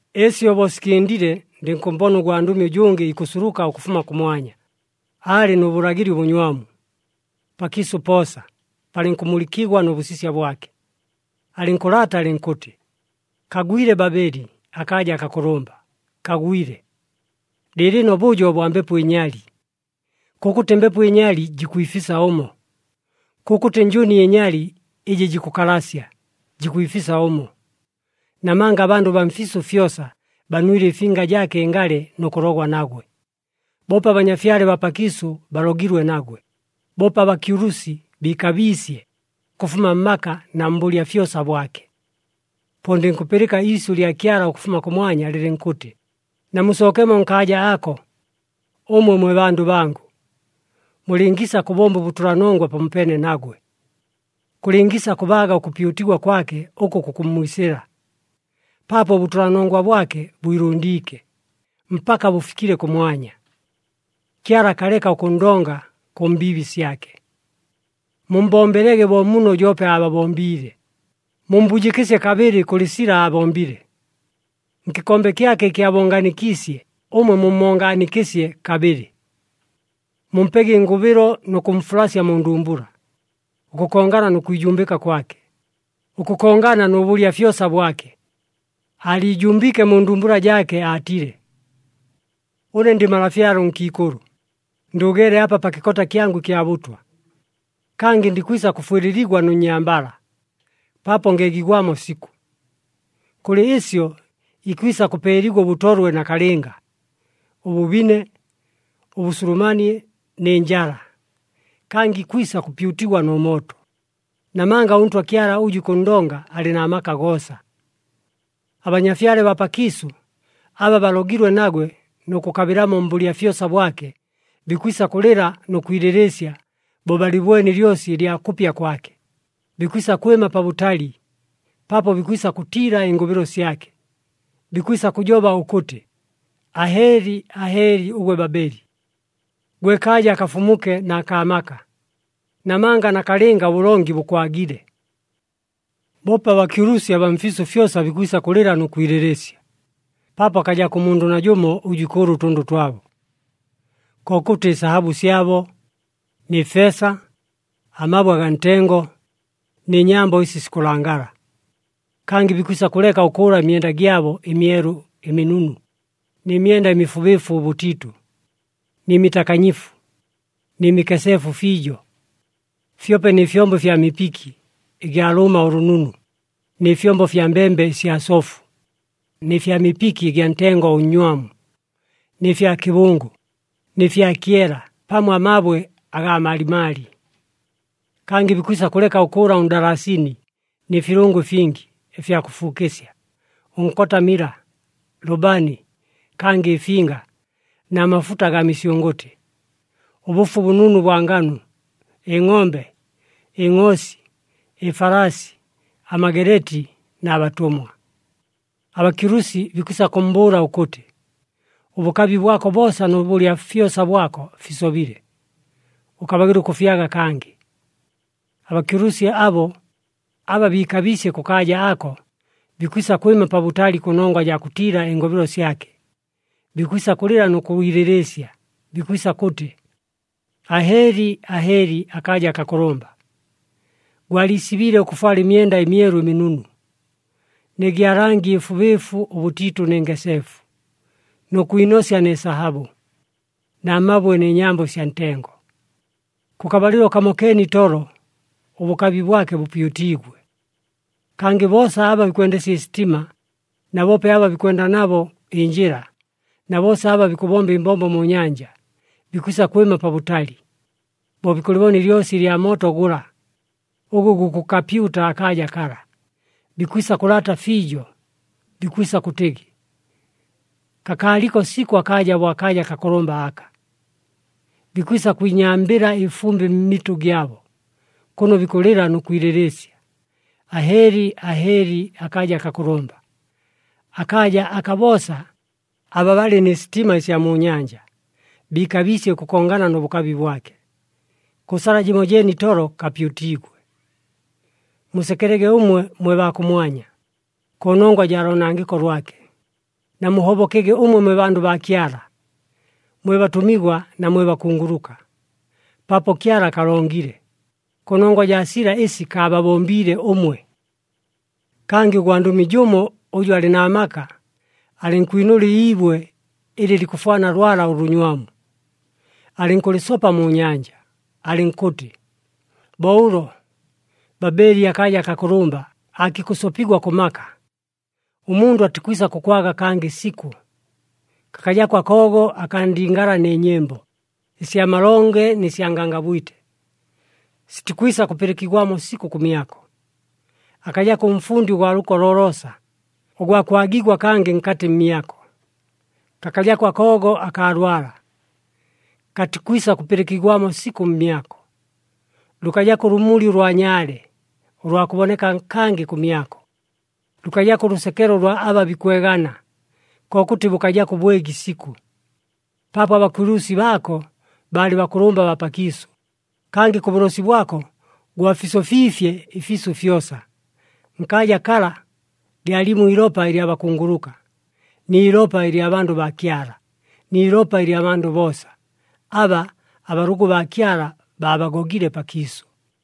Ɨsyo bo sikɨndile, ndɨnkʉmmbona ʉgwandʉmi ʉjʉngɨ ikʉsuluka ʉkʉfuma kʉmwanya, aalɨ nʉ bʉlagɨli ʉbʉnywamu. Pakiisʉ poosa palɨnkʉmulɨkigwa nʉ bʉsisya bwake. Alɨnkʉlaata alɨnkʉtɨ, “Kagwile Babeli akaaja akakʉlʉmba! Kagwile! Lɨɨlɨno bʉjo bwa mbepo ɨnyali. Kʉkʉtɨ mbepo ɨnyali jikwifisa ʉmo, kʉkʉtɨ njʉni ɨnyali ɨjɨ jikʉkalasya, jikwifisa ʉmo. Namanga abandʉ baa mfiisʉ fyosa banwile ɨfinga jaake ɨngalɨ nʉ kʉlogwa nagwe. Boope abanyafyale baa pakiisʉ balogilwe nagwe. Boope abakyulusi biikabiisye, ʉkʉfuma mmaka na mbʉlya fyosa bwake.” Po ndɨnkʉpɨlɨka iisyʉ lya Kyala ʉkʉfuma kʉmwanya lɨlɨnkʉtɨ, “Namusookemo nkaaja ako, ʉmwe mwe bandʉ bangʉ, mulɨngiisa kʉbomba ʉbʉtʉlanongwa pamopeene nagwe, kʉlɨngiisa kʉbaaga ʉkʉpyutigwa kwake ʉkʉ kukʉmmwisɨla, paapo ʉbʉtʉlanongwa bwake bwilʉndiike, mpaka bʉfikile kʉmwanya. Kyala akaleka ʉkʉnndonga kʉ mbiibi syake. Mummbombelege bo muno joope aababombiile, mummbujɨkɨsye kabɨlɨ kʉlɨ sila aabombile. Nkɨkombe kyake ɨkɨ aabongaanikiisye, ʉmwe mummongaanikɨsye kabɨlɨ. Mumpege ɨngʉbɨlo nʉ kʉmfulasya mu ndumbula, ʉkʉkongana nʉ kwijumbɨka kwake, ʉkʉkongana nʉ bʉlya fyosa bwake. Aaliijumbiike mu ndumbula jaake aatile, ‘Ʉne ndɨ malafyale ʉnkiikʉlʉ! Ndʉʉgeele apa pa kɨkota kyangʉ ɨkya bʉtwa! Kangɨ ndikwisa kʉfwɨlɨligwa nʉ nnyambala, paapo ngeegigwamo sikʉ!’ Kʉlɨ ɨsyo, ikwisa kʉpeeligwa ʉbʉtolwe nakalɨnga, ʉbʉbine, ʉbʉsulumanie, nɨ njala. Kangɨ ikwisa kʉpyutigwa nʉ mooto, namanga ʉNtwa Kyala ʉjʉ ikʉnndonga, alɨ na maka goosa.” Abanyafyale baa pakiisʉ, aba balogilwe nagwe nʉ kʉkabɨlamo mbʉlya fyosa bwake, bikwisa kʉlɨla nʉ kwilɨlɨɨsya bo balɨbwene ɨlyosi ɨlya kʉpya kwake. Bikwisa kwɨma pabʉtali paapo bikwisa kʉtiila ɨngʉbɨlo syake, bikwisa kʉjoba ʉkʉtɨ, “Ahɨɨli! Ahɨɨli ʉgwe Babeli! Gwe kaaja akafumuke na kaa maka! Namanga nakalɨnga ʉbʉlongi bʉkwagile.” Boope abakyulusi abaa mfiisʉ fyosa bikwisa kʉlɨla nʉ kwilɨlɨɨsya, paapo akajako ʉmundʉ najʉmo ʉjʉ ikʉʉla ʉtʉndʉ twabo, kokʉtɨ ɨsahabʉ syabo, nɨ feesa, amabwe agaa ntengo, nɨ nyambo ɨsi sikʉlangala. Kangɨ bikwisa kʉleka ʉkʉʉla ɨmyenda gyabo ɨmyelu ɨminunu, nɨ myenda ɨmifubɨɨfu ʉbʉtiitʉ, nɨ mitakanyifu, nɨ mikeseefu fiijo. Fyope nɨ fyombo ɨfya mipiki ɨgya lʉʉma ʉlʉnunu, nɨ fyombo fya mbembe ɨsya sofu, nɨ fya mipiki ɨgya ntengo ʉnnywamu, nɨ fya kɨbʉngʉ, nɨ fya kyela pamo amabwe agaa malimali. Kangɨ bikwisa kʉleka ʉkʉʉla ʉndalasini nɨ filʉngo ɨfingi, ɨfya kʉfuukɨsya, ʉnkota mila, lʉbani, kangɨ ɨfinga na mafuta agaa misyʉngʉtɨ, ʉbʉfu ʉbʉnunu ʉbwa nganu, ɨngʼombe, ɨngʼoosi, ɨfalaasi, amageleeti, na batʉmwa. Abakyulusi bikwisa kʉmmbʉʉla ʉkʉtɨ, “Ʉbʉkabi bwako boosa nʉ bʉlya fyosa bwako fisobile! Ʉkabagɨla ʉkʉfyaga kangɨ!” Abakyulusi abo, aba biikabiisye kʉkaaja ako, bikwisa kwɨma pabʉtali kʉnongwa jaa kʉtiila ɨngʉbɨlo syake. Bikwisa kʉlɨla nʉ kwilɨlɨɨsya, bikwisa kʉtɨ, “Ahɨɨli! Ahɨɨli akaaja akakʉlʉmba! Gwaliisibiile ʉkʉfwala ɨmyenda ɨmyelu ɨminunu, nɨ gya langi ɨfubɨɨfu ʉbʉtiitʉ nɨ ngeseefu, nʉ kwinosya nɨ sahabʉ, na mabwe nɨ nyambo ɨsya ntengo! Kʉ kabalɨlo kamokeene itolo, ʉbʉkabi bwake bʉpyutiigwe!” Kangɨ boosa aba bikwendesya ɨsitima, na boope aba bikwenda nabo ɨnjɨla, na boosa aba bikʉbomba ɨmbombo mu nyanja, bikwisa kwɨma pabʉtali. Bo bikʉlɨbona ɨlyosi lya mooto gʉla, ʉgʉ gukʉkapyuta akaaja kala, bikwisa kʉlaata fiijo, bikwisa kʉtɨgɨ, “Kakaaliko sikʉ akaaja, bo akaaja akakʉlʉmba aka!” Bikwisa kwinyambɨla ɨfumbɨ mmitʉ gyabo, kʉno bikʉlɨla nʉ kwilɨlɨɨsya, “Ahɨɨli! Ahɨɨli akaaja akakʉlʉmba! Akaaja aka boosa, aba balɨ nɨ sitima ɨsya mu nyanja, biikabiisye ʉkʉkongana nʉ bʉkabi bwake. Kʉ sala jɨmojeene itolo kapyutiigwe! Musekelege ʉmwe mwe baa kʉmwanya, kʉnongwa jaa loonangɨko lwake. Namuhobokege ʉmwe mwe bandʉ baa Kyala, mwe batʉmigwa na mwe bakunguluka! Paapo Kyala akalongile, kʉnongwa jaa sila ɨsi kaababombiile ʉmwe!” Kangɨ ʉgwandʉmi jʉmo ʉjʉ alɨ na maka, alɨnkwinʉla iibwe ɨlɨ likʉfwana lwala ʉlʉnywamu, alɨnkʉlɨsopa mu nyanja, alɨnkʉtɨ, “Bo ʉlo, Babeli, akaaja akakʉlʉmba, aakikʉsopigwa kʉ maka, ʉmundʉ atikwisa kʉkwaga kangɨ sikʉ. Kakajako akoogo akaa ndingala nɨ nyɨmbo, ɨsya malonge nɨ sya ngangabwite, sitikwisa kʉpɨlɨkigwamo sikʉ kʉmyako. Akajako ʉmfundi ʉgwa lʉko loloosa, ʉgwa kwagigwa kangɨ nkatɨ mmyako. Kakajako akoogo akaa lwala, katikwisa kʉpɨlɨkigwamo sikʉ kʉmyako. Lʉkajako ʉlʉmuli ʉlwa nyaale, ʉlwa kʉboneka kangɨ kʉmyako. Lʉkajako ʉlʉsekelo ʉlwa aba bikwegana, kokʉtɨ bʉkajako ʉbwegi sikʉ. Paapo abakyulusi baako baalɨ bakʉlʉmba baa pakiisʉ, kangɨ kʉ bʉlosi bwako gwafisofiifye ɨfiisʉ fyosa! Nkaaja kala, lyalimo iilopa ɨlya bakunguluka, ni ilopa ɨlya bandʉ baa Kyala, ni ilopa ɨlya bandʉ boosa, aba abalʉgʉ baa Kyala baabagogile pakiisʉ.”